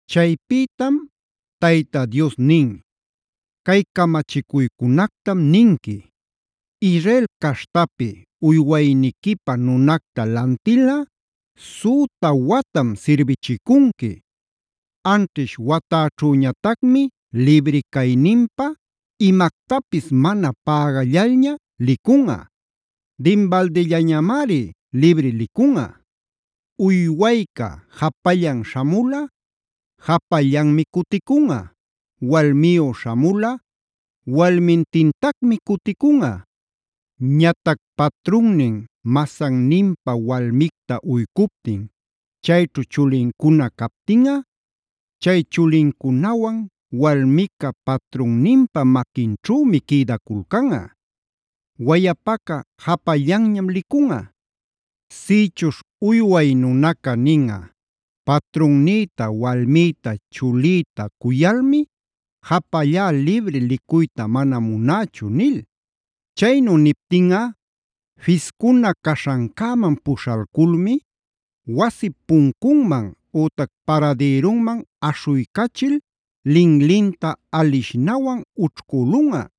Chaypïtam Tayta Dios nin: “Cay camachicuycunactam ninqui: Israel caśhtapi uywayniquipä nunacta lantilꞌa süta watam sirbichicunqui. Anćhish watäćhüñatacmi libri cayninpä imactapis mana pägallalña licunꞌa; dinbaldillañamari libri licunꞌa. Uywayca japallan śhamulꞌa japallanmi cuticunꞌa. Walmiyu śhamulꞌa walmintintacmi cuticunꞌa. Ñatac patrunnin masanninpä walmicta uycuptin, chayćhu chulincuna captinꞌa, chay chulincunawan walmica patrunninpa maquinćhümi quïdaculcanꞌa. Wayapaca japallanñam licunꞌa. Sïchuśh uyway nunaca ninꞌa: ‘Patrunnïta, walmïta, chulïta cuyalmi japallá libri licuyta mana munächu’ nil. Chaynu niptinꞌa fiscuna caśhancäman puśhalculmi wasip puncunman ütac paradïrunman aśhuycachil linlinta alishnawan ućhcülunꞌa.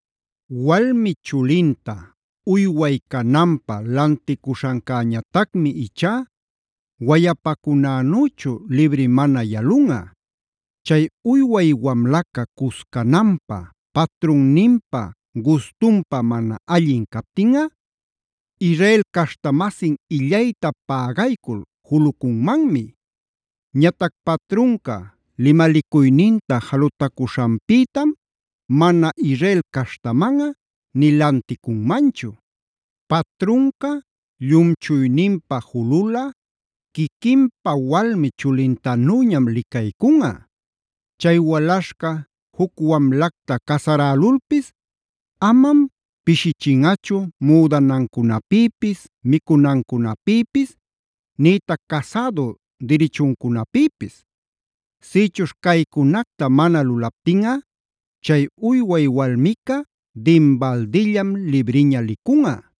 “Walmi chulinta uyway cananpä lanticuśhancäñatacmi ichá wayapacunänüchu libri mana yalunꞌa. Chay uyway wamlaca cuscananpä patrunninpa gustunpä mana allin captinꞌa, Israel caśhta-masin illayta pägaycul julucunmanmi. Ñatac patrunca limalicuyninta jalutacuśhanpïtam mana Israel caśhtamanꞌa nï lanticunmanchu. Patrunca llumchuyninpä jululꞌa quiquinpa walmi chulintanüñam licaycunꞌa. Chay walaśhca juc wamlacta casarälulpis amam pishichinꞌachu müdanancunapïpis, micunancunapïpis nïtac casädu dirichuncunapïpis. Sïchuśh caycunacta mana lulaptinꞌa, chay uyway walmica dinbaldillam libriña licunꞌa.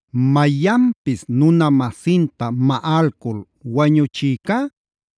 “Mayanpis nuna-masinta maꞌalcul wañuchïcá,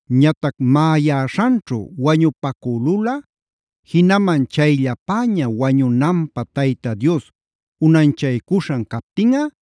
Ñatac maꞌayäśhanćhu wañupacülulꞌa, jinaman chayllapäña wañunanpä Tayta Dios unanchaycuśhan captinꞌa,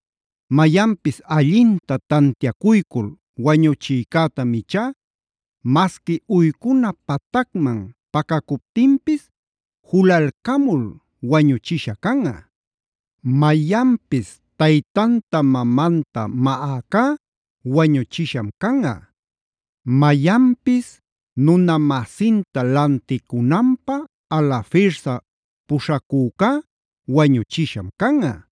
Mayanpis allinta tantiacuycul wañuchïcätam ichá masqui uycuna patacman pacacuptinpis julalcamul wañuchishä canꞌa. “Mayanpis taytanta mamanta maꞌäcá wañuchisham canꞌa. “Mayanpis nuna-masinta lanticunanpä alafirsa puśhacücá wañuchisham canꞌa.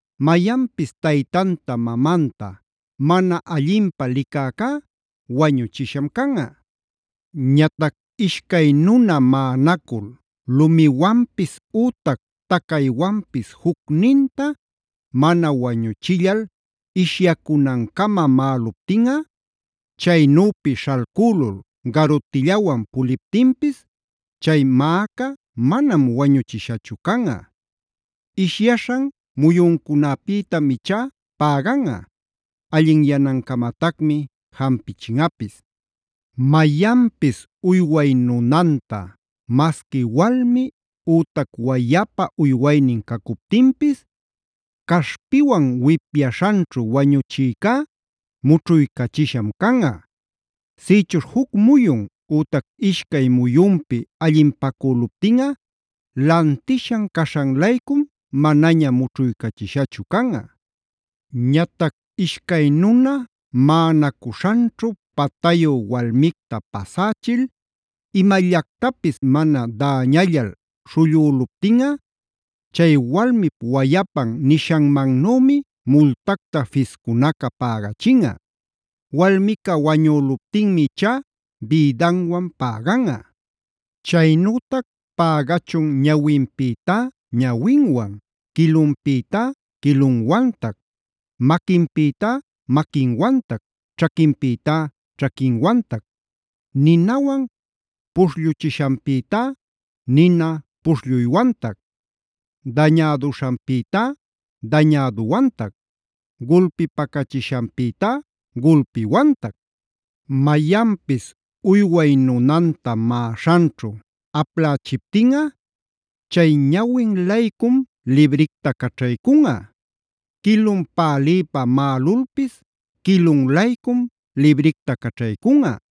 “Mayanpis taytanta mamanta mana allinpä licäcá wañuchisham canꞌa.e “Ñatac ishcay nuna maꞌanacul lumiwanpis ütac tacaywanpis jucninta mana wañuchillal ishyacunancama maꞌaluptinꞌa, chaynüpi śhalcülul garutillawan puliptinpis chay mäca manam wañuchishachu canꞌa. Ishyaśhan muyuncunäpïtam ichá päganꞌa; allinyanancamatacmi jampichinꞌapis. “Mayanpis uyway nunanta masqui walmi ütac wayapa uywaynin cacuptinpis caśhpiwan wipyaśhanćhu wañuchïcá, mućhuycachisham canꞌa. Sïchuśh juc muyun ütac ishcay muyunpi allinpacüluptinꞌa lantishan caśhan-laycum manaña mućhuycachishachu canꞌa. “Ñatac ishcay nuna maꞌanacuśhanćhu patayu walmicta pasächil imallactapis mana däñallal śhullüluptinꞌa, chay walmip wayapan nishanmanümi multacta fiscunaca pägachinꞌa. Walmica wañüluptinmi ichá bïdanwan päganꞌa. Chaynütac pägachun ñawinpïtá ñawinwan, quilunpïtá quilunwantac,f maquinpïtá maquinwantac, ćhaquinpïtá ćhaquinwantac, ninawan puśhlluchishanpïtá nina puśhlluywantac, dañäduśhanpïtá dañäduwantac, gulpipacachishanpïtá gulpiwantac. “Mayanpis uyway nunanta maꞌaśhanćhu aplächiptinꞌa, chay ñawin-laycum libricta caćhaycunꞌa. Quilun pälïpa maꞌalulpis quilun-laycum libricta caćhaycunꞌa.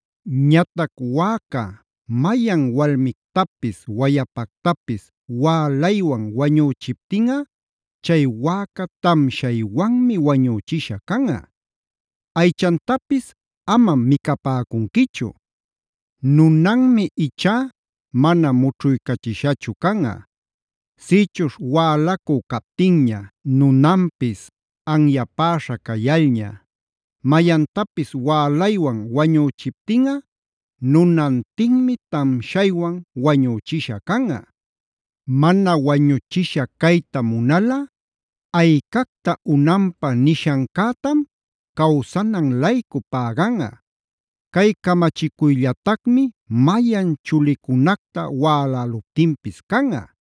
“Ñatac wäca mayan walmictapis wayapactapis wälaywan wañüchiptinꞌa, chay wäca tamshaywanmi wañüchisha canꞌa. Aychantapis amam micapäcunquichu. Nunanmi ichá mana mućhuycachishachu canꞌa. Sïchuśh wälacü captinña, nunanpis anyapäśha cayalña, mayantapis wälaywan wañüchiptinꞌa, nunantinmi tamshaywan wañüchisha canꞌa. Mana wañuchisha cayta munalꞌa aycacta unanpä nishancätam cawsanan-laycu päganꞌa. Cay camachicuyllatacmi mayan chulicunacta wäläluptinpis canꞌa.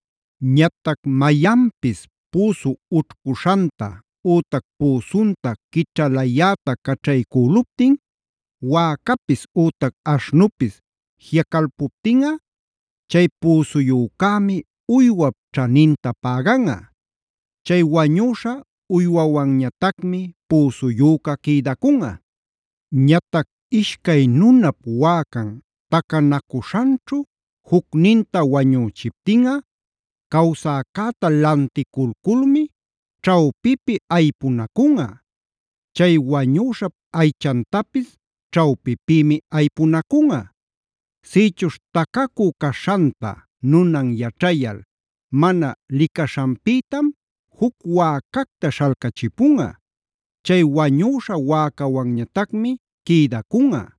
“Ñatac mayanpis püsu ućhcuśhanta ütac püsunta quićhalayäta caćhaycüluptin wäcapis ütac aśhnupis jiꞌacalpuptinꞌa, chay püsuyücämi uywap ćhaninta päganꞌa. Chay wañüśha uywawanñatacmi püsuyüca quïdacunꞌa. “Ñatac ishcay nunap wäcan tacanacuśhanćhu jucninta wañüchiptinꞌa, cawsäcäta lanticulculmi ćhawpipi aypunacunꞌa. Chay wañüśhap aychantapis ćhawpipïmi aypunacunꞌa. Sïchuśh tacacü caśhanta nunan yaćhayal mana licaśhanpïtam juc wäcacta śhalcachipunꞌa; chay wañüśha wäcawanñatacmi quïdacunꞌa.